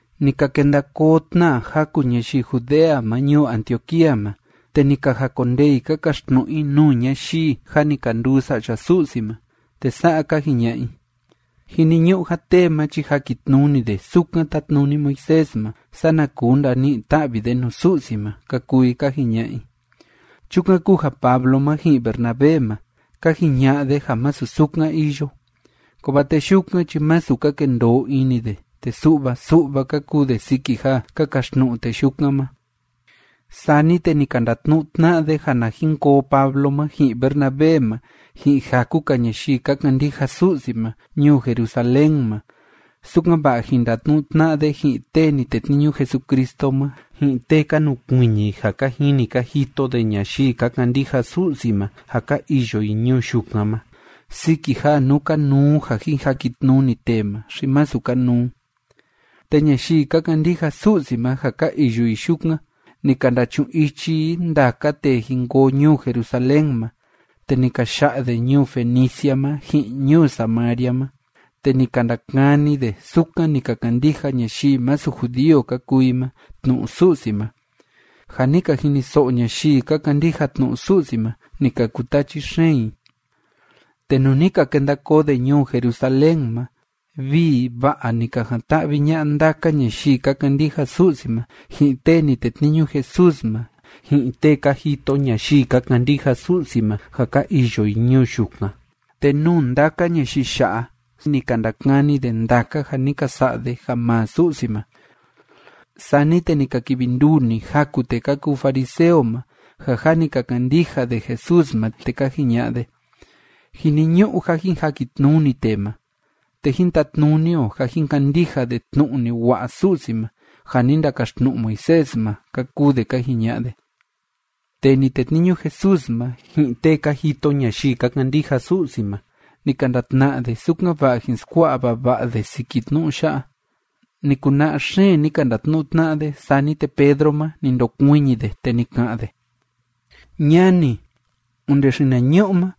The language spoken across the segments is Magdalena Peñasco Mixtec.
Ni ka kenda koo tna jaku ñayii Judea ma ñuu Antioquía ma, te ni ka jakondee i ka kaxtnu'u i nuu ñayii jâ ni ka nduu sa'ya Su'si ma, te sa'a ka jiña'a i: ―Jiniñu'u ja tee ma chi jakitnuni de sukan tátnuni Moisés ma, sana kuu ndani'i ta'vi de nuu Su'si ma ―ka kuu i ka jiña'a i. Chukan kúu ja Pablo ma ji'in Bernabé ma, ka jiña'a de ja masu sukan iyo, kovaa tee yukan chi masu ka kendoo ini de, te su'va su'va ka kuu de siki ja ka kaxtnu'u tee yukan ma. Sani te ni ka ndatnu'u tna'a de ja na jin koo Pablo ma ji'in Bernabé ma ji'in jaku‑ka ñayii ka kandija Su'si ma ñuu Jerusalén ma, sukan‑va'a jin ndatnu'u tna'a de ji'in tee ni tetniñu Jesucristo ma, ji'in tee ka nukuiñi ja ka jini ka jito de ñayii ka kandija Su'si ma ja ka iyo i ñuu yukan ma, siki ja nú kanuu ja jin jakitnuni tee ma, xi masu kanuu. Te ñayii ka kandija Su'si ma ja ka iyo i yukan, ni ka ndachu'un ichi i ndaka tee jin koo ñuu Jerusalén ma, te ni ka ya'a de ñuu Fenicia ma ji'in ñuu Samaria ma, te ni ka ndakani de sukan ni ka kandija ñayii masu judío ka kuu i ma tnu'u Su'si ma. Ja ni ka jiniso'o ñayii ka kandija tnu'u Su'si ma, ni ka kutachi xeen i. Te nuu ni ka kenda koo de ñuu Jerusalén ma, vii va'a ni ka jan‑ta'vi ña'a ndaka ñayii ka kandija Su'si ma, ji'in tee ni tetniñu Jesús ma, ji'in tee ka jito ñayii ka kandija Su'si ma ja ka iyo i ñuu yukan, te nuu ndaka ñayii ya'a ni ka ndakani de ndaka ja ni ka sa'a de ja maa Su'si ma. Sani te ni ka kivi nduu‑ni jaku tee ka kuu fariseo ma ja jâ ni ka kandija de Jesús ma, te ka jiña'a de: ―Jiniñu'u ja jin jakitnuni tee ma, te jín tatnuni o ja jín kandija de tnu'u ni wa'a Su'si ma ja ni ndakaxtnu'u Moisés ma ―ka kuu de ka jiña'a de. Tee ni tetniñu Jesús ma, ji'in tee ka jito ñayii ka kandija Su'si ma, ni ka ndatna'a de, sukan‑va'a jin skua'a vava'a de siki tnu'u ya'a. Ni kuna'a xeen ni ka ndatnu'u tna'a de. Sani te Pedro ma, ni ndokuiñi de, te ni ka'an de: ―Ñani, onde xinañu'u ma,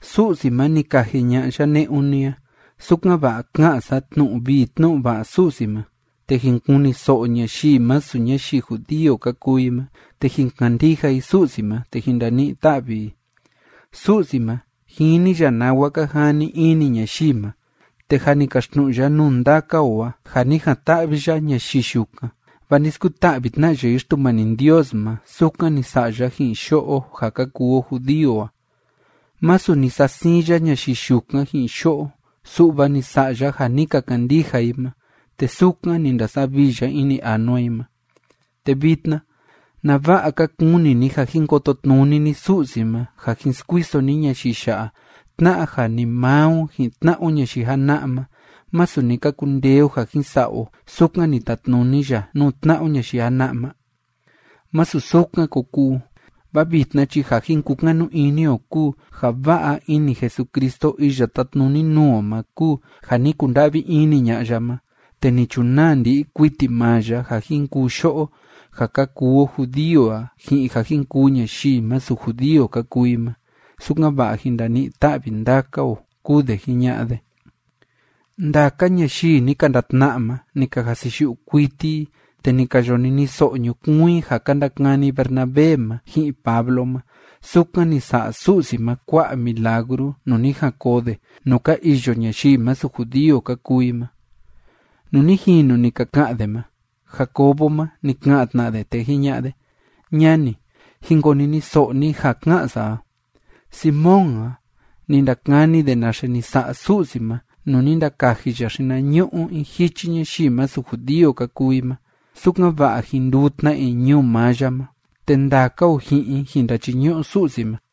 Su'si ma, ni kaji ña'a ya ne'un ni a, sukan‑va'a ka'an sa tnu'u vii tnu'u va'a Su'si ma, te jin kuniso'o ñayii masu ñayii judío ka kuu i ma, te jin kandija i Su'si ma te jin ndani'i ta'vi i. Su'si ma, jini ya nawa ka jani ini ñayii ma, te jâ ni kaxtnu'u ya nuu ndaka o a ja ni jan‑ta'vi ya ñayii yukan, vaa ni skuta'vi tna ya i Xtumani Ndios ma, sukan ni sa'a ya ji'in yo'o ja ka kuu o judío a. Masu ni sa'a siin ya ñayii yukan ji'in yo'o, su'va ni sa'a ya ja ni ka kandija i ma, te sukan ni ndasavii ya ini anua i ma. Te vitna, ¿nava'a ka kuni ni ja jin kototnuni ni Su'si ma, ja jin skuiso ni ñayii ya'a tna'a ja ni maa o ji'in tna'a o ñayii jana'a ma, masu ni ka kundee o ja jin sa'a o sukan ni tatnuni ya nuu tna'a o ñayii jana'a ma? ¡Másu sukan ko kuu! Vaa vitna chi ja jin kukanu ini o kúu ja va'a ini Jesucristo iya tátnuni nuu o ma kúu ja ni kunda'vi ini ña'a ya ma, te ni chunaa ndi'i kuiti maa ya ja jin kuu yo'o ja ka kuu o judío a ji'in ja jin kuu ñayii masu judío ka kuu i ma, sukan‑va'a jin ndani'i ta'vi ndaka o ―kúu de jiña'a de. Ndaka ñayii ni ka ndatna'a ma, ni ka jasiyu'u kuiti i, te ni ka yo niniso'o ñukuun i ja ka ndakani Bernabé ma ji'in Pablo ma sukan ni sa'a Su'si ma kua'a milagru nuu ni jan koo de nuu ka iyo ñayii masu judío ka kuu i ma. Nuu ni jinu ni ka ka'an de ma, Jacobo ma, ni ka'an tna de, te jiña'a de: ―Ñani, jin koniniso'o ni ja ka'an sa a. Simón a, ni ndakani de naxe ni sa'a Su'si ma nuu ni ndakaji ya xinañu'u in jichi ñayii masu judío ka kuu i ma, sukan‑va'a jin nduu tna i ñuu maa ya ma, te ndaka o ji'in i jin ndachiñu'u Su'si ma.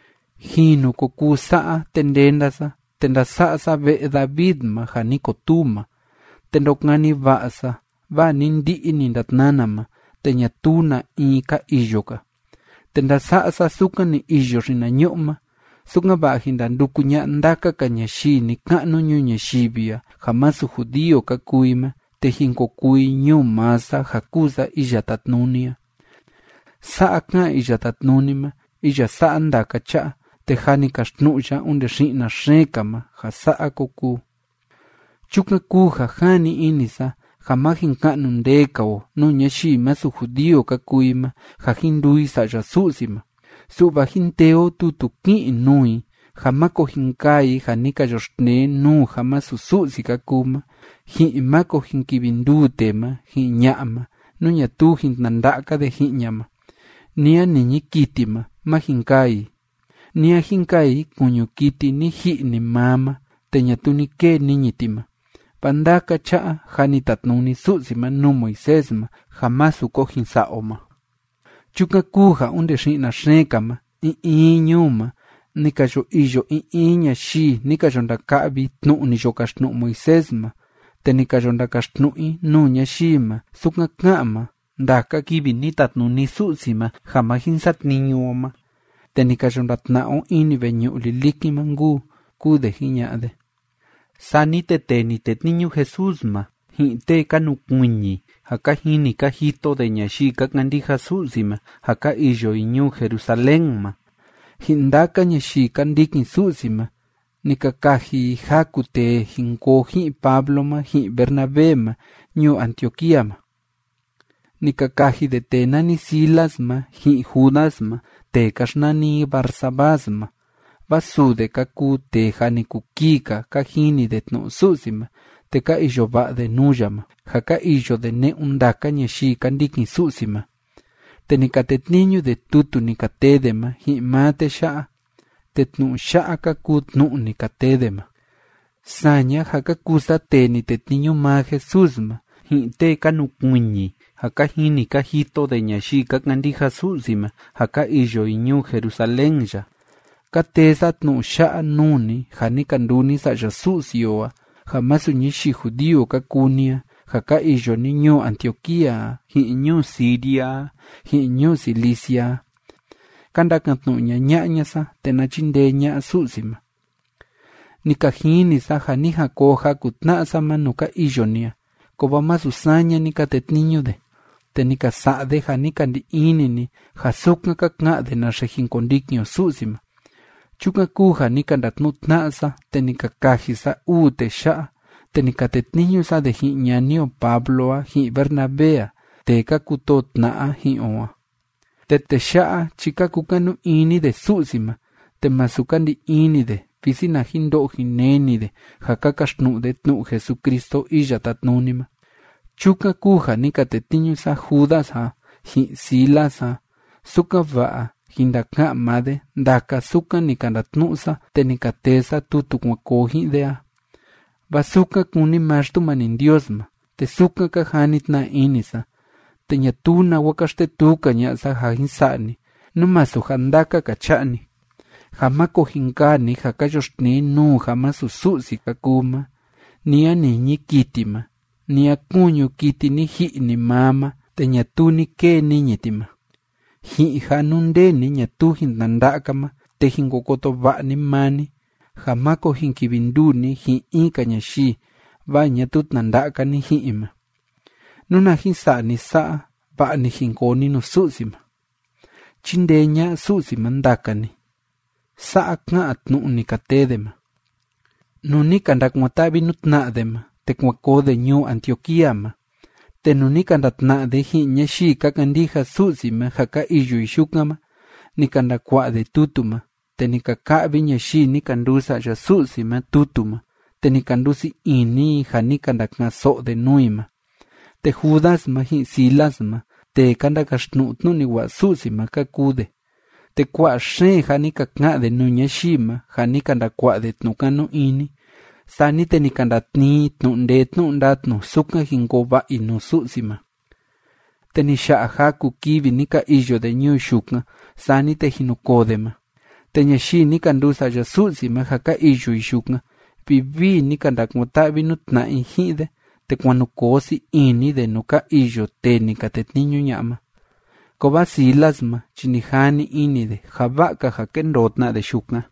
Jinu ko kuu sa'a, te ndenda sa, te ndasa'a sa ve'e David ma ja ni kotuu ma. Te ndokani va'a sa, vaa ni ndi'i ni ndatnana ma, te ñatuu na in ka iyo‑ka, te ndasa'a sa sukan ni iyo xinañu'u ma, sukan‑va'a jin ndanduku ña'a ndaka‑ka ñayii ni‑ka'nu ñuu ñayivi a, ja masu judío ka kuu i ma, te jin ko kuu i ñuu maa sa ja kúu sa Iya Tátnuni a. Sa'a ká'an Iya Tátnuni ma iya sa'a ndaka cha'a, te jâ ni kaxtnu'u ya onde xi'na xeen‑ka ma ja sa'a ko kuu. ’Chukan kúu ja jani ini sa ja má jin ka'nu ndee‑ka o nuu ñayii masu judío ka kuu i ma, ja jin nduu i sa'ya Su'si ma. Su'va jín tee o tutu kí'in nuu i, ja máko jin kaa i ja ni ka yoxtnee nuu ja masu Su'si ka kuu ma, ji'in máko jin kivi nduu tee ma ji'in ña'a ma, nú ñatuu jin tnanda'a‑ka de ji'in ña ma, ni a niñi kiti ma má jin kaa i, ni a jin kaa i kuñu kiti ni ji'i‑ni maa ma te ñatuu ni kee niñi ti ma. Vaa ndaka cha'a jâ ni tatnuni Su'si ma nuu Moisés ma ja másu ko jin sa'a o ma. Chukan kúu ja onde xi'na xeen‑ka ma, in in ñuu ma ni ka yo iyo in in ñayii ni ka yo ndaka'vi tnu'u ni yo kaxtnu'u Moisés ma, te ni ka yo ndakaxtnu'u i nuu ñayii ma sukan ká'an ma ndaka kivi ni tatnuni Su'si ma ja ma jin satniñu o ma te ni ka yo ndatna'a o ini veñu'u lilikin ma nkuu ―kúu de jiña'a de. Sani te tee ni tetniñu Jesús ma, ji'in tee ka nukuiñi ja ka jini ka jito de ñayii ka kandija Su'si ma ja ka iyo i ñuu Jerusalén ma, ji'in ndaka ñayii ka ndikin Su'si ma, ni ka kaji i jaku tee jin koo ji'in Pablo ma ji'in Bernabé ma ñuu Antioquía ma. Ni ka kaji de tee nani Silas ma, ji'in Judas ma tee ka xnani i Barsabás ma, vaa suu de ka kuu tee jâ ni kuu kii‑ka ka jini de tnu'u Su'si ma te ka iyo va'a de nuu ya ma, ja ka iyo de ne'un ndaka ñayii ka ndikin Su'si ma. Te ni ka tetniñu de tutu ni ka tee de ma ji'in maa tee ya'a. Te tnu'u ya'a ka kuu tnu'u ni ka tee de ma: “Saña ja ka kuu sa tee ni tetniñu maa Jesús ma, ji'in tee ka nukuiñi ja ka jini ka jito de ñayii ka kandija Su'si ma ja ka iyo i ñuu Jerusalén ya, ka tee sa tnu'u ya'a nuu ni ja ni ka nduu ni sa'ya Su'si o a ja masu ñayii judío ka kuu ni a ja ka iyo ni ñuu Antioquía a, ji'in ñuu Siria a, ji'in ñuu Cilicia a. Ka ndakan‑tnu'u ñaña'a ña sa, te na chindee ña'a Su'si ma. Ni ka jini sa ja ni jan koo jaku tna'a sa ma nuu ka iyo ni a, kovaa masu saña ni ka tetniñu de, te ni ka sa'a de ja ni ka ndi ini ni ja sukan ka ka'an de naxe jin kondikin o Su'si ma. Chukan kúu ja ni ka ndatnu'u tna'a sa, te ni ka kaji sa uu tee ya'a, te ni ka tetniñu sa de ji'in ñani o Pablo a, ji'in Bernabé a, tee ka kutoo tna'a ji'in o a. Te tee ya'a chi ka kukanu ini de Su'si ma, te masu ka ndi ini de visi na jin ndo'o jin neni de ja ka kaxtnu'u de tnu'u Jesucristo Iya Tátnuni ma. Chukan kúu ja ni ka tetniñu sa Judas a, ji'in Silas a, sukan‑va'a jin ndaka'an maa de ndaka sukan ni ka ndatnu'u sa te ni ka tee sa tutu kuan koo ji'in de a. Vaa sukan kúni maa Xtumani Ndios ma, te sukan ka jani tna ini sa, te ñatuu nawa ka xtetuu‑ka ña'a sa ja jin sa'a ni, nú masu ja ndaka‑ka cha'a‑ni, ja máko jin kaa ni ja ka yoxtnee nuu ja masu Su'si ka kuu ma, ni a niñi kiti ma, ni a kuñu kiti ni ji'i‑ni maa ma te ñatuu ni kee niñi ti ma, ji'in ja nú nde ni ñatuu jin tnanda'a‑ka ma te jin ko koto va'a ni maa ni ja máko jin kivi nduu ni ji'in in‑ka ñayii, vaa ñatuu tnanda'a‑ka ni ji'in i ma. Nuna jin sa'a ni sa'a, va'a‑ni jin koo ni nuu Su'si ma. Chíndee ña'a Su'si ma ndaka ni.” Sa'a ká'an tnu'u ni ka tee de ma. Nuu ni ka ndakuan‑ta'vi nuu tna'a de ma, te kuan koo de ñuu Antioquía ma, te nuu ni ka ndatna'a de ji'in ñayii ka kandija Su'si ma ja ka iyo i yukan ma, ni ka ndakua'a de tutu ma. Te ni ka ka'vi ñayii ni ka nduu sa'ya Su'si ma tutu ma, te ni ka ndusii ini i ja ni ka ndaka'an‑so'o de nuu i ma. Te Judas ma, ji'in Silas ma, tee ka ndakaxtnu'u tnu'u ni wa'a Su'si ma ka kuu de, te kua'a xeen ja ni ka ka'an de nuu ñayii ma, ja ni ka ndakua'a de tnu'u kanu ini, sani te ni ka ndatnii i tnu'u ndee tnu'u ndatnu sukan jin koo va'a i nuu Su'si ma. Te ni ya'a jaku kivi ni ka iyo de ñuu yukan, sani te jin nu koo de ma, te ñayii ni ka nduu sa'ya Su'si ma ja ka iyo i yukan, vivii ni ka ndakuan‑ta'vi nuu tna'a i ji'in de, te kuan nu koo sii ini de nuu ka iyo tee ni ka tetniñu ña'a ma. Kovaa Silas ma chi ni jani ini de ja va'a‑ka ja kendoo tna de yukan.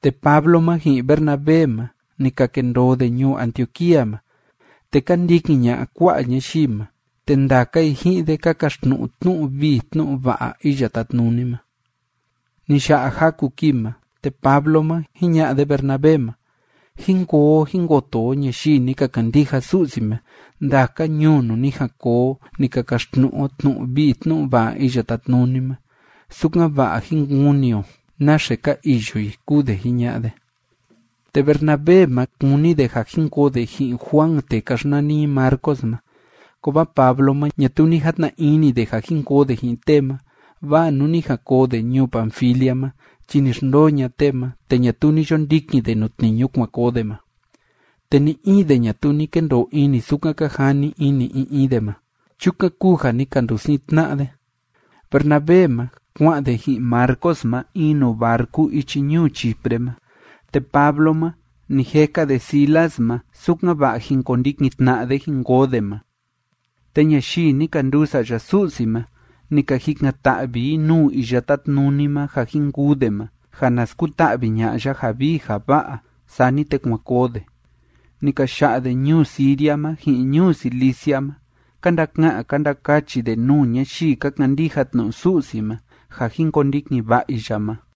Te Pablo ma ji'in Bernabé ma, ni ka kendoo de ñuu Antioquía ma, te ka ndikin ña'a kua'a ñayii ma, te ndaka i ji'in de ka kaxtnu'u tnu'u vii tnu'u va'a Iya Tátnuni ma. Ni ya'a jaku kii ma, te Pablo ma, jiña'a de Bernabé ma: ―Jín koo o jín koto o ñayii ni ka kandija Su'si ma ndaka ñuu nuu ni jan koo o ni ka kaxtnu'u o tnu'u vii tnu'u va'a Iya Tátnuni ma, sukan‑va'a jin kuni o naxe ka iyo i ―kúu de jiña'a de. Te Bernabé ma, kúni de ja jin koo de ji'in Juan tee ka xnani i Marcos ma. Kovaa Pablo ma ñatuu ni jatna ini de ja jin koo de ji'in tee ma, vaa nuu ni jan koo de ñuu Panfilia ma chi ni xndoo ña'a tee ma, te ñatuu ni yo ndikin de nuu tniñu kuan koo de ma. Te ni‑in de ñatuu ni kendoo ini sukan ka jani ini in in de ma. Chukan kúu ja ni ka ndusiin tna'a de. Bernabé ma, kua'an de ji'in Marcos ma in nuu barcu ichi ñuu Chipre ma. Te Pablo ma, ni jeka de Silas ma, sukan‑va'a jin kondikin tna'a de jin koo de ma, te ñayii ni ka nduu sa'ya Su'si ma, ni ka jikan‑ta'vi i nuu Iya Tátnuni ma ja jin kuu de ma, ja na skuta'vi ña'a ya ja vii ja va'a. Sani te kuan koo de. Ni ka ya'a de ñuu Siria ma, ji'in ñuu Cilicia ma, ka ndaka'an ka ndakachi de nuu ñayii ka kandija tnu'u Su'si ma ja jin kondikin va'a i ya ma.